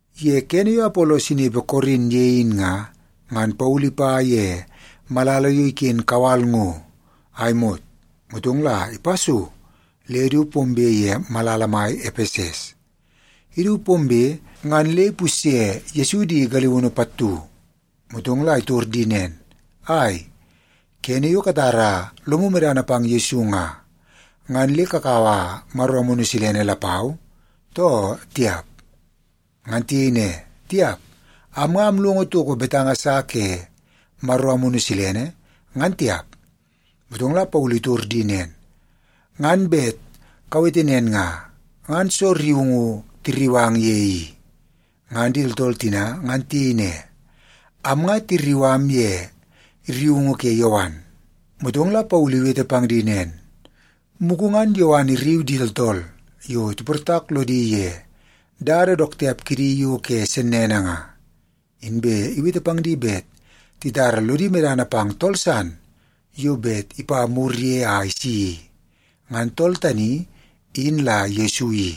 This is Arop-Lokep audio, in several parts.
Ye kene yo Apolos inepe Korin ye in nga, ngan Paulu ipa ye malala yo iken kawal ngo a imot, motong la ipa so le du pombe ye malala mai Epeses. Idu pombe, ngan le ipusye Yesu di galiunu pattu. Motong la itor di nen, “Ai, kene yo katara lomu medana pang Yesu nga, ngan le kakaua Maro Amunu Silene lapau, too tiap?” Ngan tiyei ne, “Tiap. Am nga amlongo toko betanga sa ke Maro Amunu Silene, ngan tiap.” Motong la Paulu itor di nen, “Ngan bet kawete nen nga, ngan soo rriungu tirriu ang ye i?” Ngan di tooltool tina ngan tiyei ne, “Am nga tirriu am ye rriungu ke Yowan.” Motong la Paulu iwete pang di nen, “Mugu ngan Yowan irriu di tooltool yo tiportak lodi ye dada dook tiap kidi yo ke sennene nga. Inbe iwete pang di bet titara lodi medana pang tool san yo bet ipa mur ye a isi i. Ngan tool tani in la Yesu i.”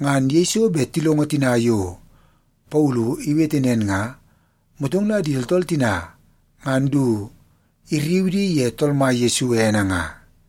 Ngan yeiso bet tilongo tina yo Paulu iwete nen nga, motong la di tooltool tina ngan du irriu di ye Tool Mai Yesu ene nga.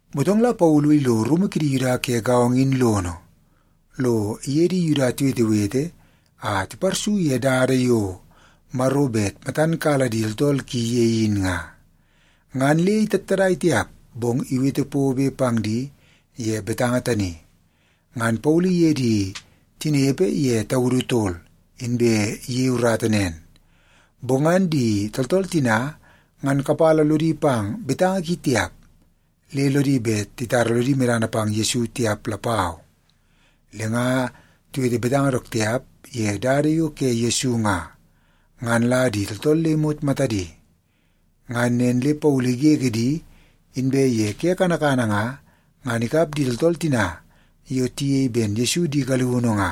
Motong la Paulu ilo rumu kidi Yuda ke gaongo in lono, lo iye di Yuda tiwetewete a tiparsu ye dada yo Maro bet matan kala di tooltool ki ye in nga. Ngan le itattadai tiap, bong iwete pobe pang di ye betanga tani. Ngan Paulu iye di tinepe ye taudu tol, inbe iyei urata nen. Bong ngan di tooltool tina ngan kapala lodi pang betanga ki tiap, le lodi bet titara lodi medana pang Yesu tiap lapau. Le nga tiwete betanga dook tiap ye Dada yo ke Yesu nga, ngan la di tooltool le imot matadi. Ngan nen le Paulu igege di, inbe ye ke kanakana nga, ngan ikap di tooltool tina yo tiyei ben Yesu di galiunu nga,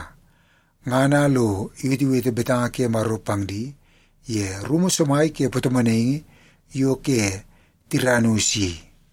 ngan a lo iwetewete betanga ke Maro pang di ye rumu somai ke patomonaingi yo ke Tiranus i.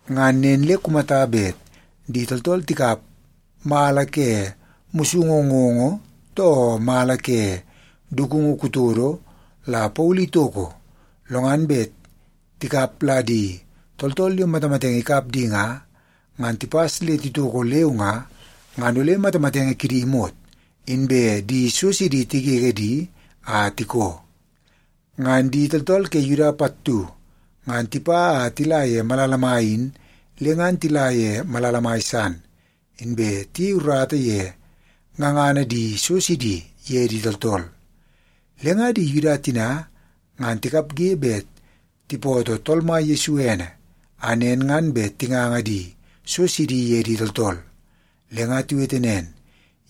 Ngan nen le kumata bet di tooltool tikap mala ke musungu ngoongoo too mala ke dukungu kutodo la Paulu itoko, lo ngan bet tikap la di tooltool yo matamatenge ikap di nga, ngan tipas le titoko leu nga, ngan ole matamatenge kidi imot, inbe di so sidi tigege di a tikoo. Ngan di tooltool kidi Yuda pattu ngan tipa a tila ye malala mai in, le ngan tila ye malala mai san, inbe tiyei urata ye ngangana di so sidi ye di tooltool. Le nga di Yuda tina ngan tikapge bet tipootoo Tool Mai Yesu ene, a nen ngan bet tinganga di so sidi ye di tooltool. Le nga tiwete nen,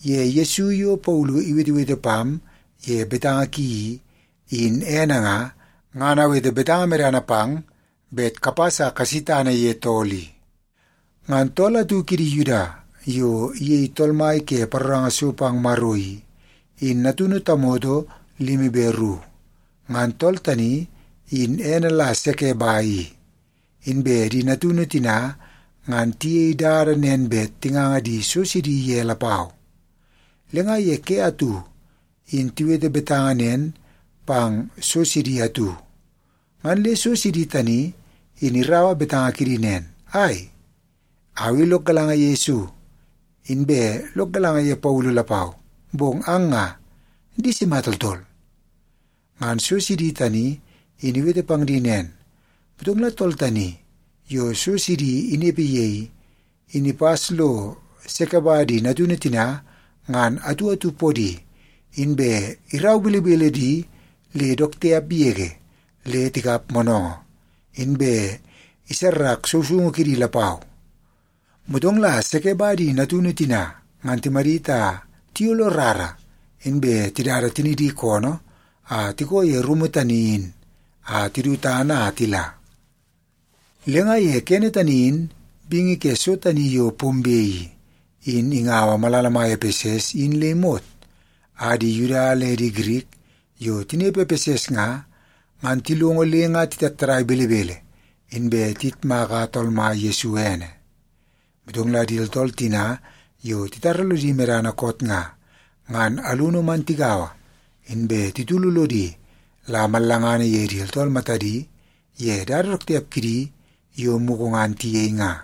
“Ye Yesu yo Paulu iwetewete pam ye betanga ki i, in ene nga, ngan awete betanga medana pang bet kapas a kasi tana ye tool i.” Ngan tool atu kidi Yuda yo iyei tool mai ke paroranga so pang Maro i, in natunu tamoto limi be ru. Ngan tool tani in ene la Sekeba i, inbe di natunu tina ngan tiyei dada nen bet tinganga di so sidi ye lapau. Le nga ye ke atu in tiwete betanga nen pang so sidi atu, ngan le so sidi tani in iraua betanga kidi nen, “Ai, au i lok galanga ye Yesu, inbe lok galanga ye Paulu lapau. Bong ang nga, di sima tooltool?” Ngan so sidi tani in iwete pang di nen, motong la tool tani yo so sidi inepe ye i, in ipas lo Sekeba di natunu tina ngan atu atu podi, inbe irau belebele di le dook tiap yege le tikap moonoongoo, inbe isarrak sousoungu kidi lapau. Motong la Sekeba di natunu tina ngan timadit a tiyolo rara, inbe tidada tinidi koonoo a tikoo ye rumu tani in a tidu tana a tila. Le nga ye kene tani in bingi ke so tani yo pombe i, in ingaua malala mai Epeses in le imot, a di Yuda le di Girik yo tinepe Epeses nga, ngan tilongo le nga titattadai belebele, inbe tiyitmaka Tool Mai Yesu ene. Motong la di tooltool tina yo titara lodi medana koot nga, ngan alunu man tigaua, inbe titulu lodi la mallangana ye di tooltool matadi ye dada dook tiap kidi yo mugu ngan tiyei nga.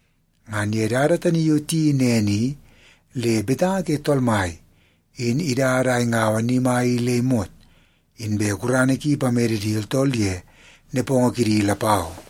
Ngan ye dada tani yo tiyeii nen i, le betanga ke Tool Mai in idada a ingaua ni mai i le imot, inbe gurana ki ipamede di tooltool ye nepongo kidi lapau.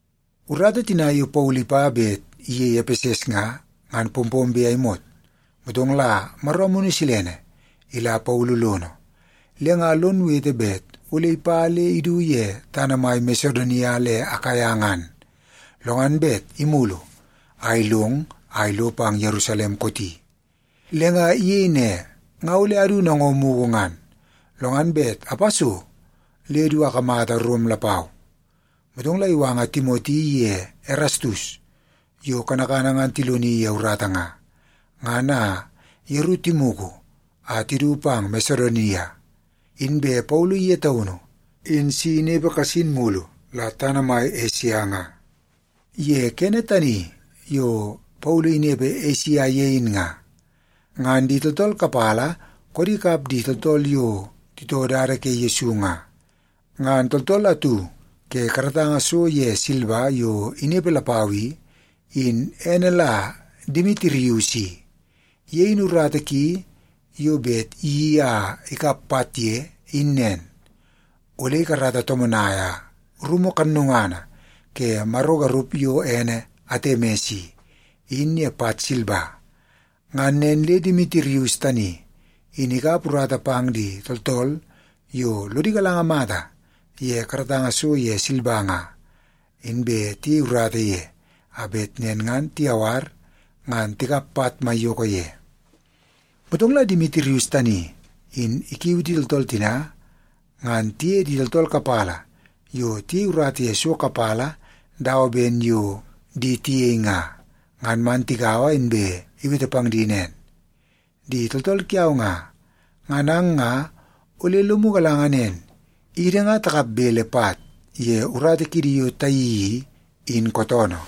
Urata tina yo Paulu ipa bet iyei Epeses nga, ngan pompombe a imot, motong la Maro Amunu Silene ila Paulu lono, le nga lon wete bet ole ipa le idu ye tana mai Masedonia le Akaia ngan, lo ngan bet imulu a ilong a ilo pang Yerusalem kooti. Le nga iyei ne, “Nga ole adu nango mugu ngan, lo ngan bet apa so le du akamata Rom lapau.” Motong la iwanga Timoti iye Erastus yo kanakana ngan tiloni ye urata nga, ngan a yeru timugu a tidu pang Masedonia. Inbe Paulu ye taunu in si inepe kasin mulu la tana mai Esia nga. Ye kene tani yo Paulu inepe Esia ye in nga, ngan di tooltool kapala koodi kap di tooltool yo titoo Dada ke Yesu nga. Ngan tooltool atu ke karatanga so ye silba yo inepe lapau i, in ene la Demitirius i. Ye in urata ki yo bet iyeii a ikap pat ye, in nen; ole ikarata tomonaia rumu kannungana ke maro garup yo ene Atemis i, in ye pat silba. Ngan nen le Demitirius tani in ikap urata pang di tooltool yo lodi galanga mata ye karatanga so ye silba nga, inbe tiyei urata ye, a bet nen ngan tiyawar ngan tikap pat maiyoko ye. Motong la Demitirius tani in ikiui di tooltool tina ngan tiye di tooltool kapala yo tiyei urata ye so kapala dawa ben yo di tiyei nga, ngan man tigaua, inbe iwete pang di nen, “Di tooltool kiau nga, ngan ang nga ole lomu galanga nen, idi nga takap bele pat ye urata kiidi yo tayeii i, in kootoonoo.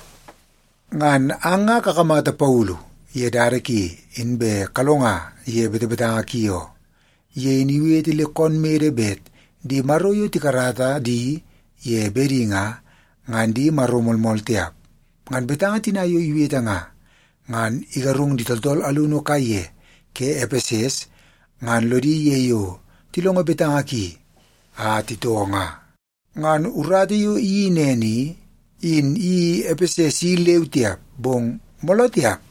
Ngan ang nga kakamata Paulu ye dada ki, inbe kalonga ye betebetanga ki oo. Ye in iwete le koon mede bet di maro yo takarata di ye bede nga, nga di maro moolmool tiap. Ngan betanga tina yo iwete nga, ngan igarung di tooltool alunu kaiye ke Epeses, ngan lodi ye yo tilongo betanga ki a titoo nga. Ngan urata yo iyeii nen i, in iyeii Epeses i leu tiap, bong mooloo tiap,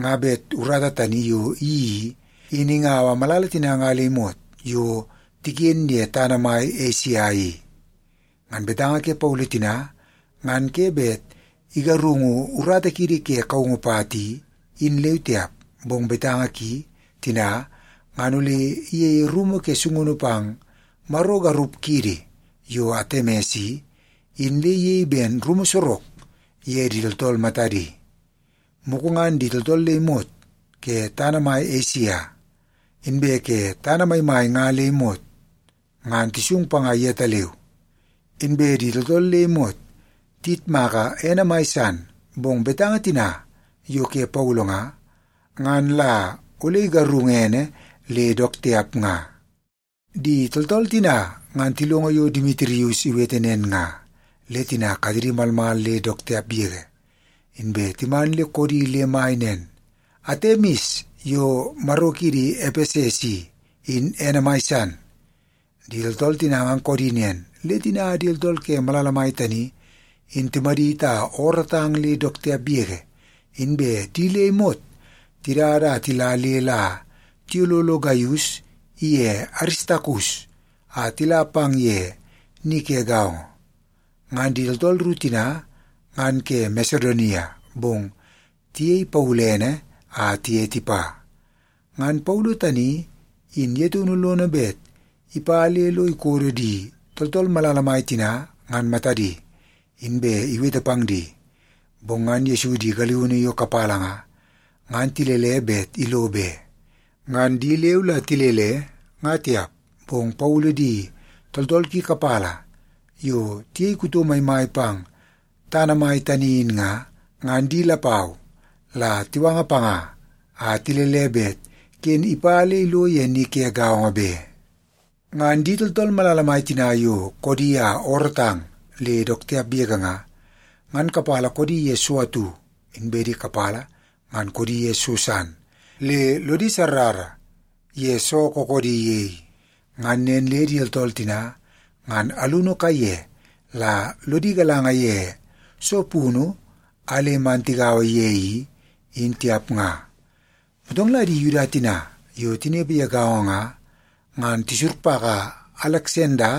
nga bet urata tani yo iyeii i, in ingaua malala tina nga le imot yo tiken ye tana mai Esia i. Ngan betanga ke Paulu tina ngan ke bet igarungu urata kiidi ke kaungu pat i, in leu tiap, bong betanga ki tina ngan ole iyeie rumu ke sungunu pang maro garup kiidi yo Atemis i, in le iyei ben rumu sorok ye di tooltool matadi. Mugu ngan di tooltool le imot ke tana mai Esia, inbe ke tana maimai nga le imot, ngan tisung panga yetaleu. Inbe di tooltool le imot tiyitmaka ene mai san, bong betanga tina yo ke Paulu nga, ngan la ole igarungu ene le dook tiap nga.” Di tooltool tina ngan tilongo yo Demitirius iwete nen nga, le tina katedi malmal le dook tiap yege, inbe timan le koodi le mai nen, “Atemis yo maro kiidi Epeses i, in ene mai san!” Di tooltool tina ngan koodi nen, le tina di tooltool ke malala mai tani in timadit a oorootang le dook tiap yege, inbe di le imot tidada a tila le la tiyololo Gaius iye Aristakus a tila pang ye ni ke gaongo. Ngan di tooltool ru tina ngan ke Masedonia, bong tiyei Paulu ene a tiye tipa. Ngan Paulu tani in ye taunu lono bet ipa le lo ikodo di tooltool malala mai tina ngan matadi, inbe iwete pang di. Bong ngan Yesu di galiunu yo kapala nga, ngan tilele bet ilo be. Ngan di leu la tilele, nga tiap, bong Paulu di tooltool ki kapala yo tiyei kuto maimai pang tana mai tani in nga, ngan di lapau la tiwanga panga a tilele bet ken ipa le ilo ye ni ke gaongo be. Ngan di tooltool malala mai tina yo koodi a oorootang le dook tiap yege nga, ngan kapala koodi ye so atu, inbe di kapala ngan koodi ye so san, le lodi sarrara ye soo kookoodi ye i. Ngan nen le di tooltool tina ngan alunu kaiye la lodi galanga ye soo punu a le man tigaua ye i, in tiap nga. Motong la di Yuda tina yo tinepe ye gaongo nga, ngan tisurpaka Aleksanda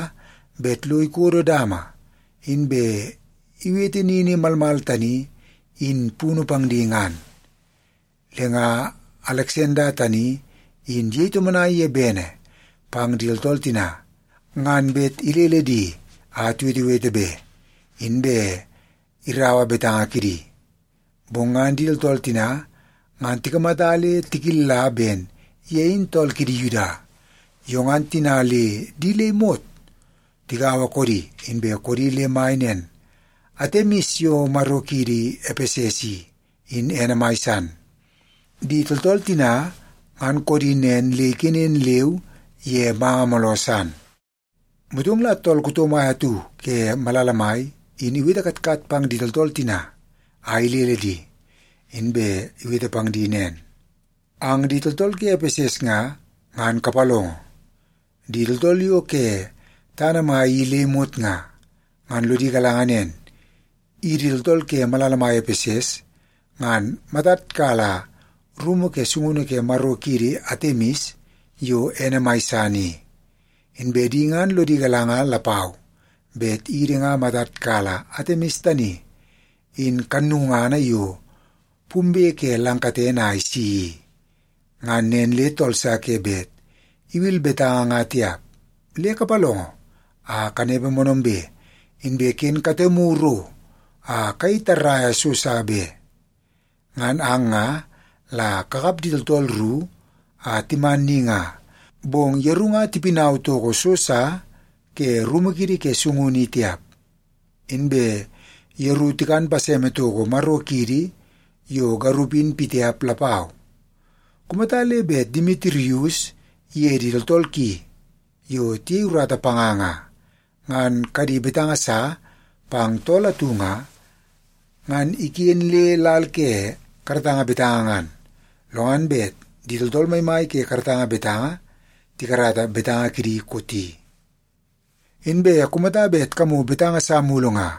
bet lo ikodo dama, inbe iwete nini malmal tani in punu pang di ngan. Le nga Aleksanda tani in iyei tomonai ye bene pang di tooltool tina ngan bet ilele di a tiwetewete be, inbe irau betanga kidi. Bong ngan di tooltool tina ngan tikamata le tikilla ben ye in tool kidi Yuda. Yo ngan tina le di le imot tigaua koodi, inbe koodi le mai nen, “Atemis yo maro kiidi Epeses i, in ene mai san!” Di tooltool tina ngan koodi nen le ikenen leu ye manga mooloo san. Motong la tool kuto mai atu ke malala mai in iwete katkat pang di tooltool tina a ilele di, inbe iwete pang di nen, “Ang di tooltool ke Epeses nga, ngan kapalongo! Di tooltool yo ke tana mai i le imot nga, ngan lodi galanga nen, idi tooltool ke malala mai Epeses ngan matad kala rumu ke sungunu ke maro kiidi Atemis yo ene mai san i. Inbe di ngan lodi galanga lapau bet idi ngan matad kala Atemis tani in kannungana yo pumbe ke lang katene a isi i. Ngan nen le tool sa ke bet iwil betanga nga tiap. Le kapalongo a kanepe moonoombe, inbe ken katemu ro a kayei tarraia so sa be. Ngan ang nga la kakap di tooltool ru a timan ni nga, bong yeru nga tipinau toko so sa ke rumu kiidi ke sungunu i tiap. Inbe yeru tikan paseme toko maro kiidi yo garup in pitiap lapau. Kumata le bet Demitirius iye di tooltool ki yo tiyei urata panga nga, ngan kadi betanga sa pang tool atu nga, ngan iken le lal ke karatanga betanga ngan, lo ngan bet di tooltool maimai ke karatanga betanga tikarata betanga kidi kooti. Inbe kumata bet kamu betanga sa mulu nga,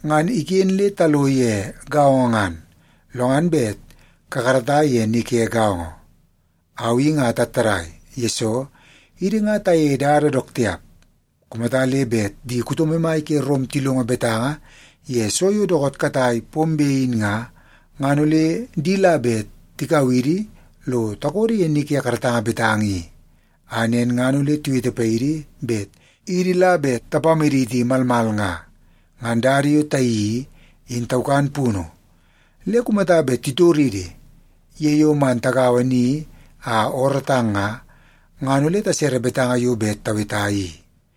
ngan iken le talo ye gaongo ngan, lo ngan bet kakarata ye ni ke gaongo. Au i nga atattadai, yesoo idi nga tayeie dada dook tiap. Kumata le bet di kuto maimai ke Rom tilongo betanga ye so yo dookoot katai pombe in nga, ngan ole di la bet tikau idi lo takodo ye ni ke karatanga betanga i, a nen ngan ole tiwete paidi bet idi la bet tapamaditi malmal nga. Ngan dada yo tayeii i, in taukan punu. Le kumata bet titoridi ye yo man tagaua ni a oorootang nga, ngan ole tasere betanga yo bet taweta i.”